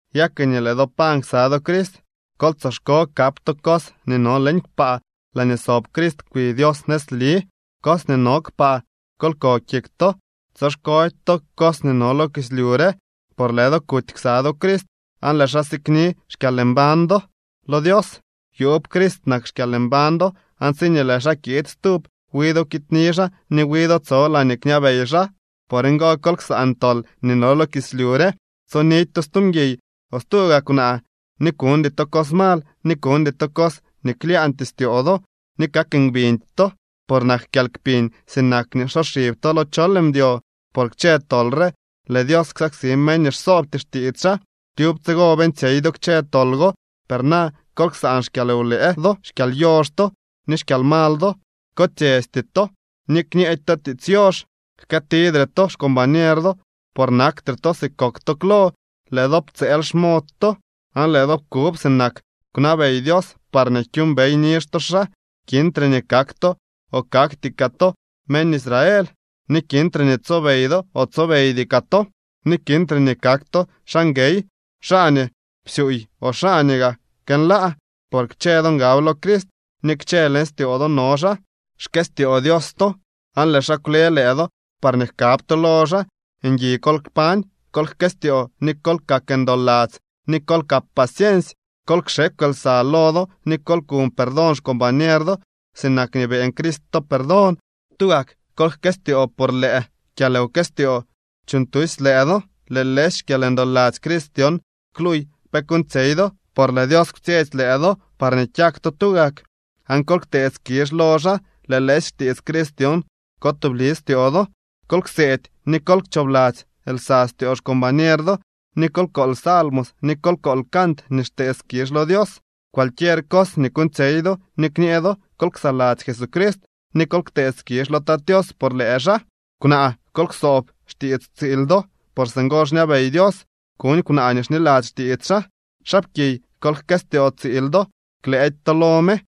Ya ke nii lëë do pañ ksa do Crist kol tsoxko kap to cos nii no leñ kpaa laañee sob Crist kwi Dios nëzli. Cos nii no kpaa kol ko kik to, tsoxkody to cos nii no lo kislyu re. Por lëë do kuty ksa do Crist aan lëë xaa sikni xkyalmbañ do lo Dios. Yuub Crist nak xkyalmbañ do, aan tsiñee lëë xaa kiid stub wi do kiidni xaa ni wi do tso laañee kñabey xaa. Por ngo, kol ksaan tol nii no lo kislyu re. Tsonidy to stu mguiy o stu gaa kwnaa, ni kuñdy to cos mal, ni kuñdy to cos nii klyaañtyee styoo do. Ni kak ngbiñdy to, por nak kyalkpiñ sinak nii nsoxib to lo chol mdyo. Por kchë tol re lëë Dios ksaksi meñ nii xsoobty xtiits xaa. Tyub tsigo beeñtsyey do kchë tol go. Per na kol ksaan xkyalwlëë do, xkyalyox to ni xkyalmal do. Kotsyesty to ni kñeedy to tiits yox. Jkëëtidre to xcombañer do, por naktre to si kok to klo, lëë do ptsëël xmod to, aan lëë do pkub sinak kwnabey Dios parñee kyuumbey nizh to xaa. Kintre nii kak to o kakty kaa to meñ Israel, ni kintre ni tsobey do o tsobeydy kaa to, ni kintre nii kak to xaa nguey, xaa nii psyuuy o xaa nii gaa kënlaa, por kchë do ngab lo Crist ni kchë leñ styoo do no xaa. Xkëstyoo Dios to aan lëë xaa kwle lëë do parñee jkab to lo xaa. Ngui kol kpañ, kol jkëstyoo, ni kol kak ndoladzy, ni kol kap paciensy. Kol kxekw lsa lo do ni kol kuñ perdón xcombañer do, sinak nii beeñ Crist to perdón. Tugak kol jkëstyoo por lëë kyalwkëstyoo xyuuñtusy lëë do. Lëë lëësy xkyalndoladzy Crist dyon kluuy pe kuuñtsyey do, por lëë Dios kwtsyetsy lëë do parñee kyak to tugak. Aan kol ktee skizh lo xaa. Lëë lëësy xtiits Crist dyon ko tubli styoo do. Kol kseedy ni kol kchoobladzy lsa styoo xcombañer do, ni kol kool salmos, ni kol kool cant nii xtee skizh lo Dios. Cualquier cos nii kuuñtsyey do ni kñee do, kol ksaladzy Jesucrist, ni kol ktee skizh lo Tat Tios por lëë xaa. Kwnaa, kol ksoob xtiits tsiil do, por singo xñabey Dios kuñ kwnaa nii xniladzy xtiits xaa. Xaapkiy, kol jkëstyoo tsiil do, klëëdy to lo me.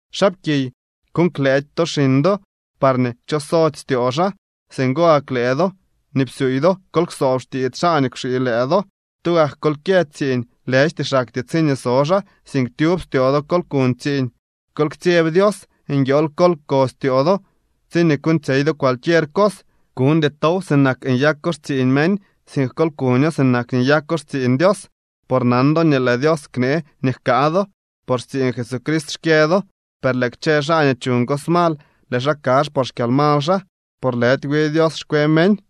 Xaapkiy, kuuñ klëëdy to xiñ do, parñee kchosody styoo xaa. Singo gak lëë do nii psyuuy do, kol ksoob xtiits xaa nii kwxii lëë do. Tugak kol kyë tsiiñ, lëjty xaktyee tsiñee so xaa, sink tyub styoo do kol kuñ tsiiñ. Kol ktsyeb Dios. Nguiool kol ko styoo do tsiñee kuuñtsyey do cualquier cos. Kuñdy tow sinak nyako xtsiiñ meñ, sink kol kuño sinak nii nyako xtsiiñ Dios. Por nan do nii lëë Dios knee nii jkaa do. Por xtsiiñ Jesucrist xkyë do. Per lëë kchë xaa nii chuñ cos mal, lëë xaa kazh por xkyalmal xaa, por lëdy wi Dios xkwe meñ.